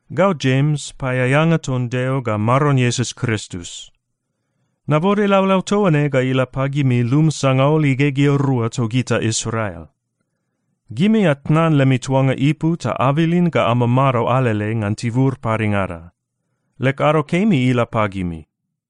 Gau Jems, paeaeanga ton Deo ga Maron Iesus Kristus. Nabode laulau toa ne ga ila pagimi lum sangaul igegea rua togita Israel. Gimi atnan lemi tuanga ipu ta abilin ga amamado alele ngan tibur padengada. Leg ado kemi ila pagimi.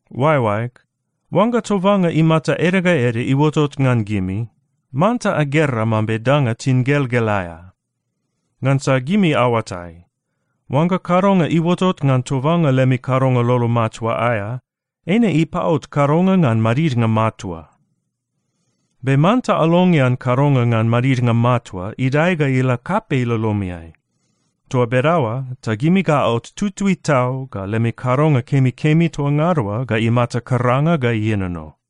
Oaeoaeg, oangga tobanga imata ede ga ede iuotot ngan gimi, manta agera mambe danga tingelgel aea. Ngansa gimi aoatai, oangga kadonga iuotot ngan tobanga lemi kadonga lolo matua aea, eine ipaot kadonga ngan madidnga matua. Be manta alongean kadonga ngan madidnga matua idae ga ila kapei lolomiai. Toa bedaoa ta gimi ga aot tutui tau ga lemi kadonga kemikemi toa ngada oa ga imata karanga ga ienono.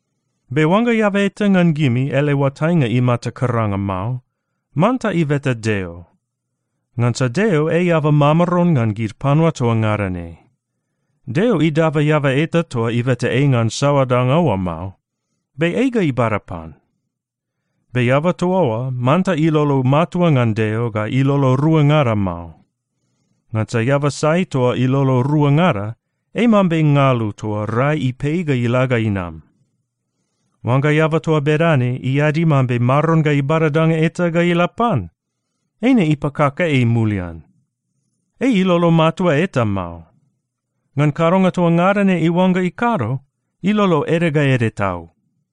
Be oangga eaba eta ngan gimi ele oatainga imata karanga mao, manta ibeta Deo. Ngansa Deo ei eaba mamaron ngan gid panua toa ngada ne. Deo idaba eaba eta toa ibeta ei ngan saoa danga oa mao. Be ei ga ibada pan. Be eaba toa oa manta ilolo matua ngan Deo ga ilolo ruangada mao. Ngansa eaba sai toa ilolo ruangada, ei mambe ngalu toa rai ipei ga ila ga inam. Oangga eaba toa bedane iadi mambe Maron ga ibada danga eta ga ila pan, eine ipakaka ei mulian. Ei ilolo matua eta mao. Ngan kadonga toa ngada ne iuangga ikado, ilolo ede ga ede tau.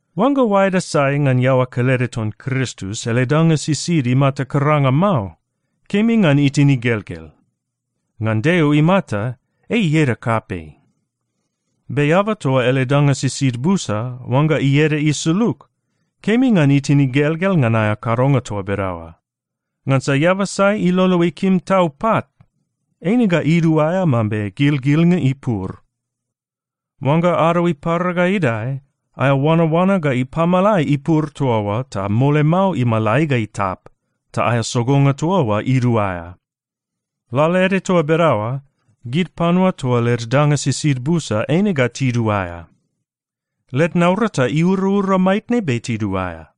Oangga oaeda sai ngan iaoa kelede ton Kristus ele danga sisid imata karanga mao, kemi ngan itin igelgel. Ngan Deo imata, ei ieda kapei. Be eaba toa ele danga sisid busa, oangga ieda isulug, kemi ngan itin igelgel ngan aea kadonga toa bedaoa. Ngansa eaba sai ilolo ikim tau pat, eine ga iduaea mambe gilgilnga ipur. Oangga ado ipara ga idae, aea oanaoana ga ipamalai ipur toa oa ta mole mao imalai ga itap, ta aea sogonga toa oa iduaea. Lalaede toa bedaoa, gid panua toa led danga sisid busa, eine ga tiduaea. Led naurata iuraura maitne be tiduaea.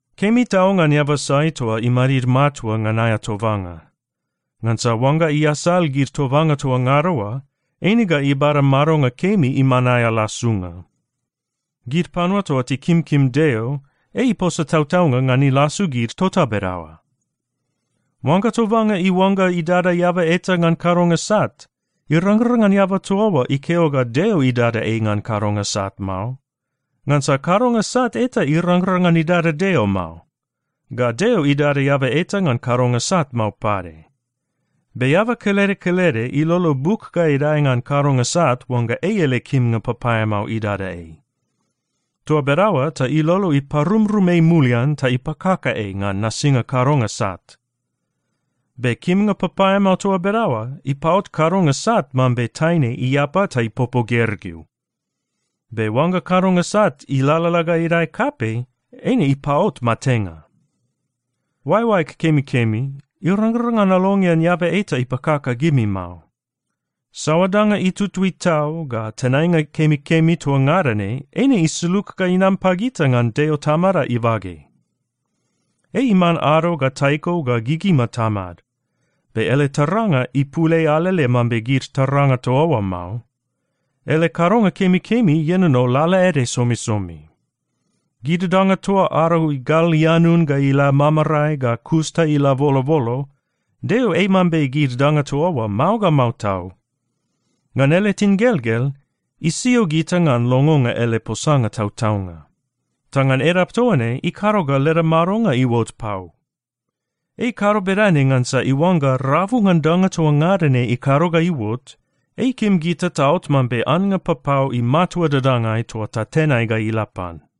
Kemi tau ngan eaba sai toa imadid matua ngan aea tobanga. Ngansa oangga iasal gid tobanga toa ngada oa, eine ga ibada madonga kemi iman aea lasunga. Gid panua toa tikimkim Deo, ei iposa tautaunga ngan ilasu gid tota bedaoa. Oangga tobanga iuangga idada eaba eta ngan kadonga sat, irangrang ngan eaba toa oa ikeo ga Deo idada ei ngan kadonga sat mao. Ngansa kadonga sat eta irangrang ngan idada Deo mao, ga Deo idada eaba eta ngan kadonga sat mao pade. Be eaba kelede kelede ilolo buk ga idae ngan kadonga sat oangga ei ele kimnga papaeamao idada ei. Toa bedaoa ta ilolo iparumrum ei mulian ta ipakaka ei ngan nasinga kadonga sat. Be kimnga papaeamao toa bedaoa ipaot kadonga sat mambe taine iapa ta ipopo gergeu. Be oangga kadonga sat ilalala ga idae kapei, eine ipaot matenga. Oaeoaeg kemikemi, irangrang ngan alongean eaba eta ipakaka gimi mao. Saoa danga itutui tau ga tenainga kemikemi toa ngada ne, eine isulug ga inam pagita ngan Deo Tamada ibage. Ei iman ado ga taiko ga gigima tamad. Be ele taranga ipul ei alele mambe gid taranga toa oa mao. Ele kadonga kemikemi ienono lalaede somisomi. Gid danga toa ado igal ianun ga ila mamarae ga kus ta ila bolobolo, Deo ei mambe gid danga toa oa mao ga mao tau. Ngan ele tingelgel, isio gita ngan longonga ele posanga tautaunga. Ta ngan edap toa ne ikado ga leda madonga iuot pau. Ei ikado bedane ngansa iuangga rabu ngan danga toa ngada ne ikado ga iuot, ei ikim gita taot mambe annga papau imatua dadangai toa tatenai ga ila pan.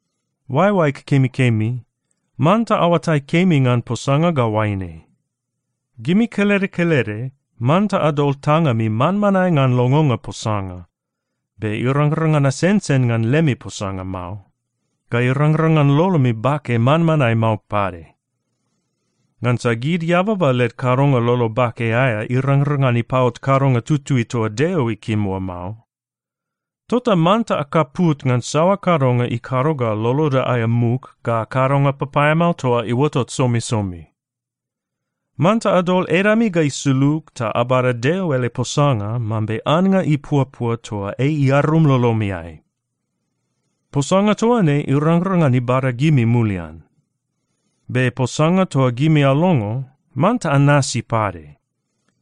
Oaeoaeg kemikemi, manta aoatai kemi ngan posanga ga oaine: Gimi kelede kelede manta adol tangami manmanae ngan longonga posanga. Be irangrang ngan asensen ngan lemi posanga mao. Ga irangrang ngan lolomi bake manmanae mao pade. Ngansa gid eababa led kadonga lolo bake aea irangrang ngan ipaot kadonga tutui toa Deo ikim oa mao. Tota manta akaput ngan saoa kadonga ikado ga loloda aea muk ga kadonga papaeamao toa iuotot somisomi. Manta adol edami ga isulug ta abada Deo ele posanga mambe annga ipuapua toa ei iarum lolomiai. Posanga toa ne irangrang ngan ibada gimi mulian. Be posanga toa gimi alongo, manta anasi pade.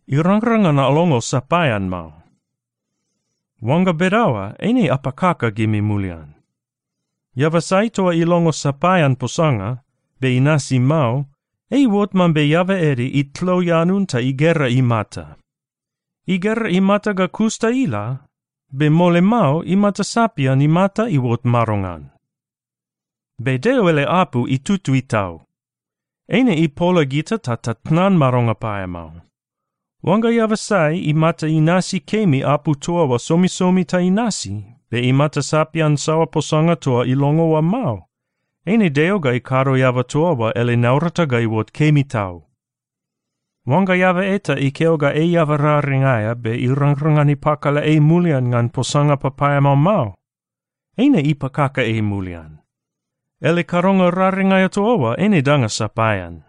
Irangrang ngan alongo sapaean mao. Oangga bedaoa, eine apakaka gimi mulian. Eaba sai toa ilongo sapaean posanga, be inasi mao, ei iuot mambe eaba ede itlo ianun ta igera imata. Igera imata ga kus ta ila, be mole mao imata sapian imata iuot madongan. Be Deo ele apu itutui tau. Eine ipola gita ta tatnan madonga paeamao. Oangga eaba sai imata inasi kemi apu toa oa somisomi ta inasi, be imata sapian saoa posanga toa ilongo oa mao, eine Deo ga ikado eaba toa oa ele naurata ga iuot kemi tau. Oangga eaba eta ikeo ga ei eaba raring aea be irangrang ngan ipakala ei mulian ngan posanga papaeamao mao, eine ipakaka ei mulian. Ele kadonga raring aea toa oa eine danga sapaean.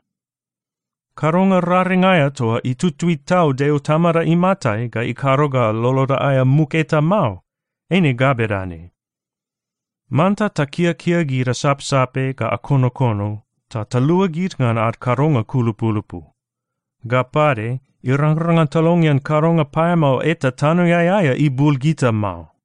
Kadonga raring aea toa itutui tau Deo Tamada imatai ga ikado ga loloda aea muk eta mao, eine ga bedane: Manta takiakia gid asapsape ga akonokono ta talua gid ngan ad kadonga kulupulupu. Ga pade, irangrang ngan talongean kadonga paeamao eta tanoeai aea ibul gita mao.